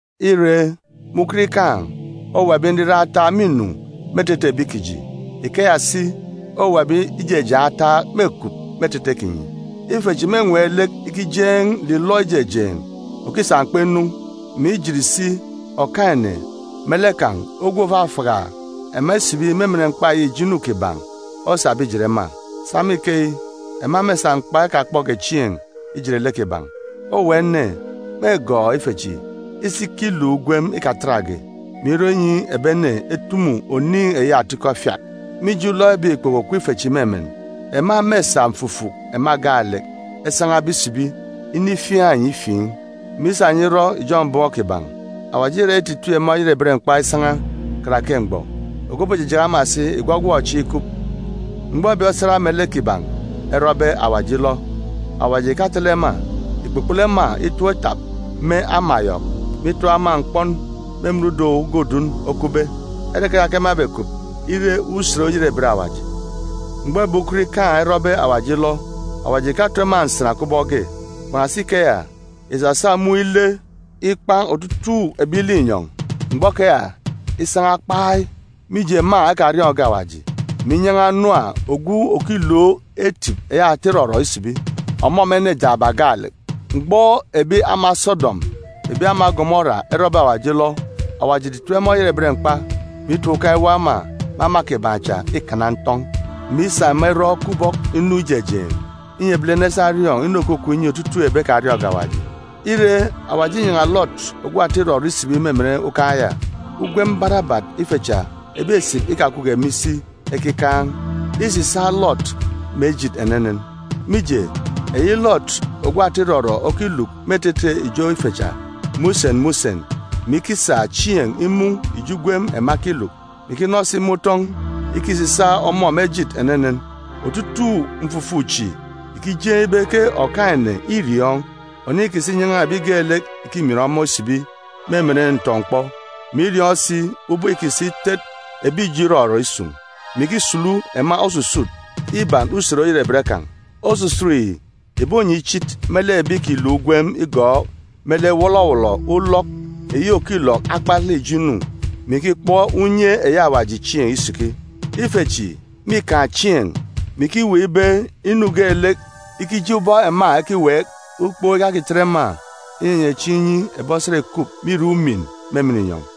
Ire, me ukot ikaan̄, owuwa ebi nriran ataak mînu me etete ebi kiji. Ikeya si, owuwa ebi ijejeen̄ ataak mêkup me etete kinyi. Ife chi mênween̄ lek ikijeen̄ nlilọ ijejeen̄ òkisa mkpa inu, mè ijit si Okaan̄-ene me lek kan̄ ogwu òfafaka ema isibi me emen mkpa eyi ijo inu kiban̄ osabe ijet ema. Sa me ikeyi, ema mêsa mkpa ekakpọge chieen̄ ijet lek kiban̄. Owuwa ene mêgọọk ife chi isi ikiluk ijo ugwem barabat, mè isa me ikeya irọ inyi ebi ene etumu oniin̄ eyi atikọ efiat. Mije ulọk ebek ikpoko òkup ife chi me emen, ema mêsa mfufuk ema gaalek esan̄abe isibi inifiaan̄ enyi ifiin̄, mè isa enyi irọ ijọn̄ mbọm kiban̄. Awaji îra ititip ema oyerebet mkpa isan̄a karake mgbọ. Ogwu òbojijaka ema si ìgwọgwọk chieen̄ ikup. Mgbọ ebi osat me lek kiban̄ erọbe Awaji ilọ, Awaji ìkatele ema. Ìkpukpulu ema itọp itap me ama yọk, mè itap ema mkpọn me emen udọn̄ uga òdudun. Ere keya ke ema ebekup ire Usen Oyerebet Awaji. Mgbọ ebi ukot ikaan̄ erọbe Awaji ilọ, Awaji ìkato ema nsan kubọk ge. Kpan̄asi ikeya, ìsasa mun̄ ile ikpan̄ otutuuk ebi linyọn̄ mgbọ keya isan̄a kpai, mije ema ekariọọn̄ge Awaji, mè inyan̄a Nuwa ogwu òkilook etip eyi ata irọrọ isibi, ọmọ mè ene jaaba gaalek. Mgbọ ebi ama Sodọm mè ebi ama Gomora erọbe Awaji ilọ, Awaji ìtitip ema oyerebet mkpa, mè itap ukan̄ iwọp ema mè ama kiban̄ cha ikana ntọn̄, mè isa ema irọ kubọk inu ijejeen̄, inyi ebilene esa eriọọn̄ inu òkukup inyi otutuuk ebi ekariọọn̄ge Awaji. Ire, Awaji înyan̄a Lọt ogwu ata irọrọ isibi me emen ukan̄ ya. Ugwem barabat ife cha, ebi esip ikakupge me isi ekikaan̄, îsisaak Lọt me ejit enenen. Mije, eyi Lọt ogwu ata irọrọ okiluk me etete ijo ife cha me usen me usen, mè ikisa chieen̄ imun̄ ijo ugwem ema ekiluk, mè ikinọ si me utọn̄, îkisisaak ọmọ me ejit enenen. Otutuuk mfufuk chi ìkijeen̄ ibe ke Okaan̄-ene îriọọn̄ oniin̄ îkisa inyan̄a ebi geelek ìkimin ọmọ isibi me emen ntọ-mkpọ, mè iriọọn̄ si ubọk îkisa itet ebi ijo irọrọ isun̄, mè ikisulu ema osusut iban Usen Oyerebet kan̄. Osusut yi ìbonye ichit me lek ebi ìkiluk ugwem igọọk me lek wọlọwọlọ ulọk eyi òkilọk akpalek ijo inu, mè ikikpọ unye eyi Awaji chieen̄ isiki. Ife chi mîkaan̄ chieen̄, mè ikiweek ibe inu geelek ikije ubọk ema ekiweek. Ukpook ìkakitet ema inyenye chieen̄ inyi ebi osat ìkup me irek umin me emen inyọn̄.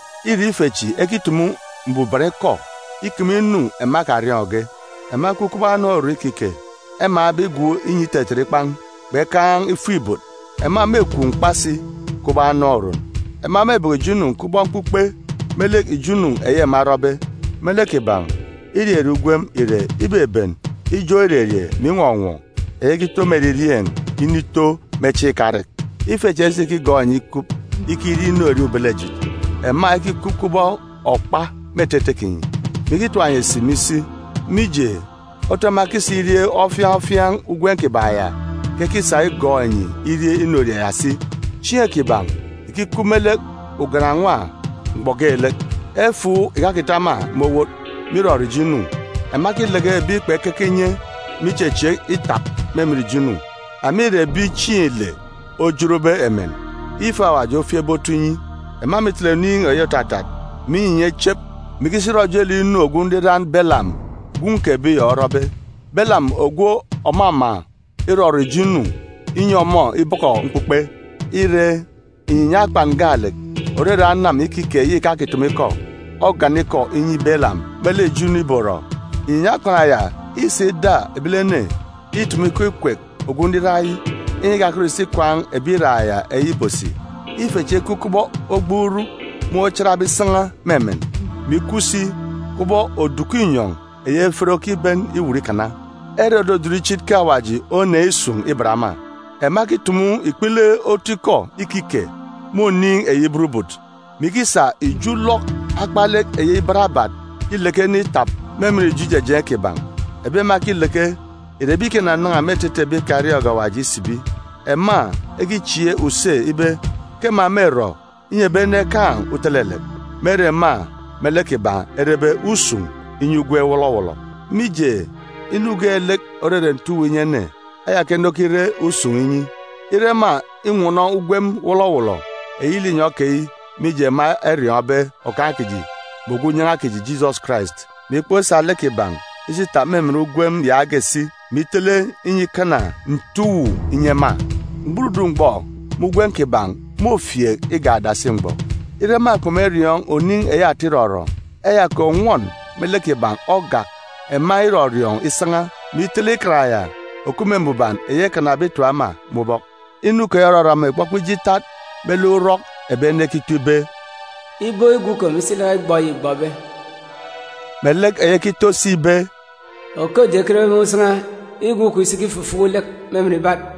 Ire, ife chi ekitumu mbuban ikọ ikeme inu ema ekariọọn̄ge. Ema ekup kubọk anam oron ikike, emaan̄be igwook inyi itetet ikpan̄, kpekaan̄ ifuk-ibot. Ema mêkwaan̄ mkpa si kubọk anam oron. Ema mêbọkọ ijo inu kubọk mkpukpe me lek ijo inu eyi ema erọbe. Me lek kiban̄, irerie ugwem ìre ibeben ijọk irerie mè inwọnwọ eyi ekito me eririeen̄ inito me chieen̄ ikarek. Ife cha isikigọọk enyi ikup ikirie inorie ubelejit, ema ekikup kubọk okpa me etete kinyi, mè ikitap enyi esip me isi. Mije, otu ema ekisa irie ofiaan̄ ofiaan̄ ugwem kiban̄ ya ke ekisa igọọk enyi irie inorie ya si. Chieen̄ kiban̄ ìkikup me lek ugan-nwa mgbọ geelek. Efuuk ìkakita ema me owot me irọrọ ijo inu. Ema ekileke ebi kpekeke inye me ichechieek itap me emen ijo inu. Ema ìre ebi chieen̄ ile ojotbe emen, ife Awaji ofieekbe otu inyi. Ema mîtele oniin̄ eyi òtatat, mè inyinya ichep, mè ikisi irọ ojelek inu ogwu nriran Balam gwun̄ kè Beyọ orọbe, Balam ogwu òmama irọrọ ijo inu, inyi ọmọ ibọkọ mkpukpe. Ire, inyinya akpan gaalek, òrere anam ikike eyi ìkakitumu ikọ, ogana ikọ inyi Balam me lek ijo inu ìborọ. Inyinya akpan ya ìsa ida ebilene itumu ikọ ikwek ogwu nriran yi, inyi ikakọt ìsi ikwaan̄ ebi iraak ya eyi ìbosi. Ife chi ekup kubọk ogbuuruk mun̄ ochatbe isan̄a me emen, mè ikup si kubọk oduku inyọn̄ eyi efet okiben iwut ikana. Ere òdudun ichit ke Awaji oneen̄ isun̄ iban ema. Ema ekitumu ikpele otu ikọ ikike me oniin̄ eyi burubut, mè ikisa ijo ulọk akpalek eyi barabat ileke ene itap me emen ijo ijejeen̄ kiban̄. Ebi ema ekileke ìre ebi ìkinanan̄a me etete ebi ekariọọn̄ge Awaji isibi. Ema ekichieek use ibe ke ema mêrọ inyi ebi ene ekaan̄ utelelek, me ere ema me lek kiban̄ erebe usun̄ inyi ugwem wọlọwọlọ. Mije, inu geelek òrere nte uwu inyi ene, eya ke ene okire usun̄ inyi. Ire ema inwọnọ ugwem wọlọwọlọ eyi linyọn̄ keyi mije ema eriọọn̄be Okaan̄ kiji mè Ogwu Unyan̄a kiji Jisọs Karais, mè ikpọk isa lek kiban̄ isi itap me emen ugwem yaage si, mè itele inyi ikana nte uwu inyi ema, mgburudun̄ mgbọ me ugwem kiban̄ môfieek igak adasi mgbọ. Ire ema kpemeriọọn̄ oniin̄ eyi ata irọrọ, eya kè ònwọn me lek kiban̄ ogak ema irọriọọn̄ isan̄a, mè itele ikan ya òkup me mbuban eyi ekanabe itap ema me ubọk. Inu keyi òrọrọ ema ìkpọkpọ ije itat me lek urọk ebi ene ekito ibe, “Ibo îgwu ikom isi ilaka igbọ eyi îgbọbe,”a melek eyi ekito si ibe, “Okodi ekenbe mun̄ isan̄a, îgwu ikom isi ikifufuku lek me emen ibat.”